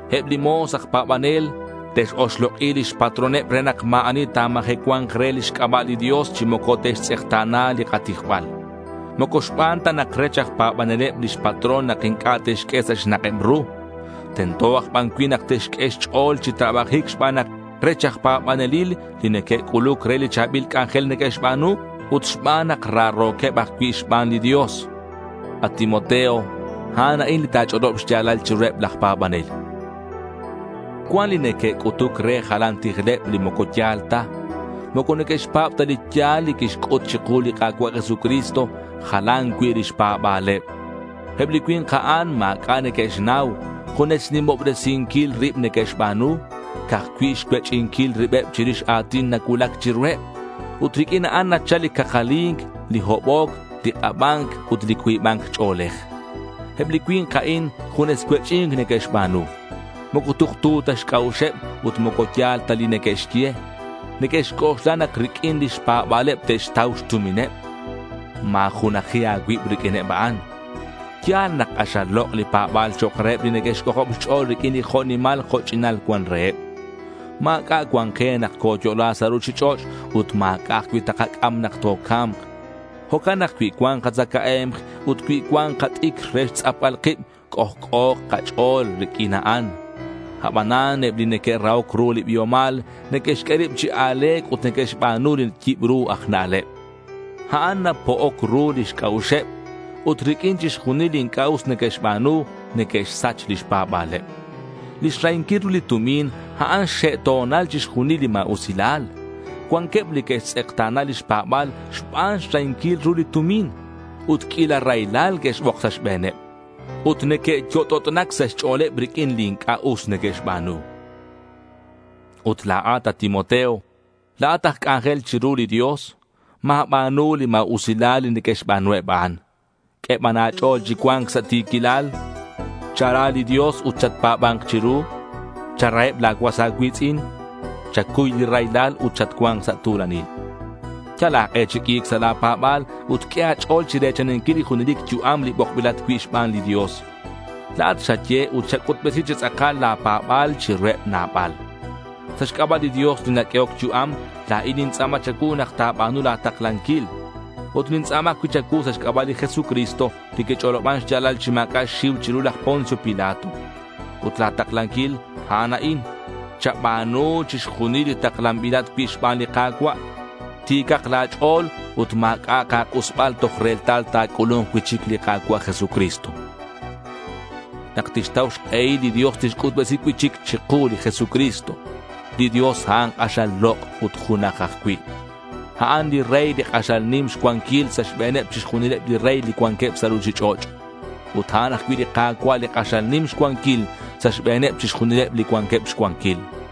Eb li mo̱s aj pa̱baneleb te'x-oxlok'i lix patroneb re nak ma̱ ani ta̱majecua̱nk re lix c'aba' li Dios chi moco te'xtz'ekta̱na li katijbal. Moco xban ta nak rech aj pa̱baneleb lix patrón nak inc'a' te'xq'ue sa' xnak'eb ru. Tento aj ban cui' nak te'xq'ue xch'o̱l chi trabajic xban nak rech aj pa̱banelil li neque'c'uluc re li cha̱bil c'anjel neque'xba̱nu ut xban nak raro̱queb ajcui' xban li Dios. At Timoteo, a'an a'in li ta̱ch'olob xya̱lal chiruheb laj pa̱banel. Cuan li neque'c'utuc re jalan tijleb li moco ya̱l ta. Moco neque'xpa̱b ta li ya̱l li quixc'ut chiku li Ka̱cua' Jesucristo. Jalan cui' lix pa̱ba̱leb. Eb li cui̱nk a'an ma̱c'a' neque'xnau. Junes xnimobresinquil rib neque'xba̱nu. Ca'aj cui' xcuech'inquil ribeb chirix a̱tin nacuulac chiruheb. Ut riq'uin a'an nachal li cakali̱nc, li hoboc, li k'aba̱nc ut li cuiba̱nc ch'o̱lej. Eb li cui̱nk a'in, junes cuech'i̱nc neque'xba̱nu. Moco tuktu ta xc'a'uxeb ut moco ya̱l ta li neque'xye. Neque'xc'oxla nak riq'uin lix pa̱ba̱leb te'xtau xtumineb. Ma̱junaji a̱cuib riq'uineb a'an. Ya̱l nak k'axal lok' li pa̱ba̱l chok' reheb li neque'xc'ojob xch'o̱l riq'uin li jo' nimal jo' ch'inal cuan reheb. Ma̱c'a' cuan ke nak coyo'la sa' ruchich'och' ut ma̱c'a' ajcui' takac'am nak toca̱mk. Jo'can nak cui cuan katzacae̱mk ut cui cuan kat'icr re xtz'apbal kib, c'ojc'o̱k kach'o̱l riq'uin a'an. Abanan eb li neque'rahoc ru li biomal, neque'xq'ue rib chi a̱le̱c ut neque'xba̱nu li yibru aj na'leb. A'an napo'oc ru lix c'a'uxeb ut riq'uin chixjunil li inc'a' us neque'xba̱nu, neque'xsach lix pa̱ba̱leb. Li xrahinquil ru li tumin, a'an xxe' xto̱nal chixjunil li ma̱usilal. Cuanqueb li que'xtz'ekta̱na lix pa̱ba̱l xban xrahinquil ru li tumin. Ut q'uila raylal que'xbok sa' xbe̱neb. Ut neque'yot'ot'nac sa' xch'o̱leb riq'uin li inc'a' us neque'xba̱nu. Ut la̱at, at Timoteo, la̱at aj c'anjel chiru li Dios. Ma̱ba̱nu li ma̱usilal li neque'xba̱nu eb a'an. Q'ue ban a̱ch'o̱l chi cua̱nc sa' ti̱quilal. Chara li Dios ut chatpa̱ba̱nk chiru. Charaheb la̱ cuas a̱cui̱tz'in. Chacuy li raylal ut chatcua̱nk sa' tu̱lanil. Yal a̱k'e chi q'ui̱c sa' la̱ pa̱ba̱l ut q'ue a̱ch'o̱l chire̱chaninquil li junelic yu'am, li bokbilat cui' xban li Dios. La̱at xaye ut xac'utbesi chi tz'akal la̱ pa̱ba̱l chiruheb nabal. Sa' xc'aba' li Dios li naq'uehoc yu'am, la̱in nintz'a̱ma cha̱cuu nak ta̱ba̱nu la̱ taklanquil. Ut nintz'a̱ma ajcui' cha̱cuu sa' xc'aba' li Jesucristo li quich'oloban xya̱lal chi ma̱c'a' xxiu chiru laj Poncio Pilato. Ut la̱ taklanquil, a'an a'in: chaba̱nu chixjunil li taklanbilat cui' xban li Ka̱cua'. Ti̱cak la̱ ch'o̱l ut ma̱c'a'ak a̱k'usbal toj retal ta̱c'ulu̱nk cui'chic li Ka̱cua' Jesucristo. Nak tixtau xk'ehil li Dios tixc'utbesi cui'chic chiku li Jesucristo. Li Dios, a'an k'axal lok' ut junaj ajcui'. A'an li Rey li k'axal nim xcuanquil sa' xbe̱neb chixjunileb li rey li cuanqueb sa' ruchich'och'. Ut a'an ajcui' li Ka̱cua' li k'axal nim xcuanquil sa' xbe̱neb chixjunileb li cuanqueb xcuanquil.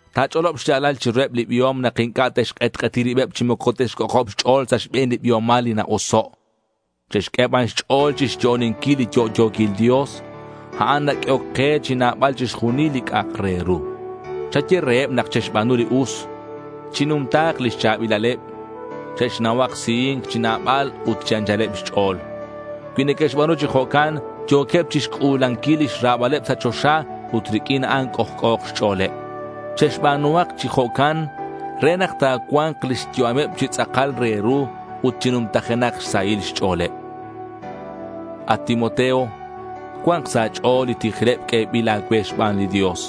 Ta̱ch'olob xya̱lal chiruheb li biom nak inc'a' te'xk'etk'eti ribeb chi moco te'xc'ojob xch'o̱l sa' xbe̱n li biomal li na-oso'. Che'xq'ue ban xch'o̱l chixyo'oninquil li yo'yo̱quil Dios. A'an naq'uehoc ke chi nabal chixjunil li c'a'ak re ru. Chaye reheb nak che'xba̱nu li us. Chinumta̱k lix cha̱bilaleb. Che'xnauhak sihi̱nc chi nabal ut chi anchaleb xch'o̱l. Cui neque'xba̱nu chi jo'can yo̱queb chixc'u̱lanquil lix ra̱baleb sa' choxa ut riq'uin a'an c'ojc'o̱k xch'o̱leb. Che'xba̱nuhak chi jo'can re nak ta̱cua̱nk lix yu'ameb chi tz'akal re ru ut chi numtajenak xsahil xch'o̱leb. At Timoteo, cua̱nk sa' a̱ch'o̱l li tijleb q'uebil a̱cue xban li Dios.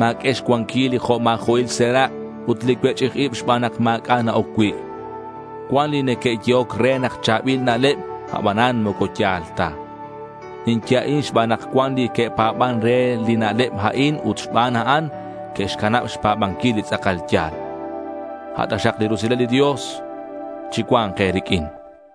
Ma̱q'ue xcuanquil li jo' ma̱jo'il serak' ut li cuech'ij ib xban nak ma̱c'a' na-oc cui'. Cuan li neque'yehoc re nak cha̱bil na'leb, abanan moco ya̱l ta. Ninye a'in xban nak cuan li que'pa̱ban re li na'leb a'in ut xban a'an, que'xcanab xpa̱banquil li tz'akal ya̱l. A' taxak li rusilal li Dios chicua̱nk e̱riq'uin.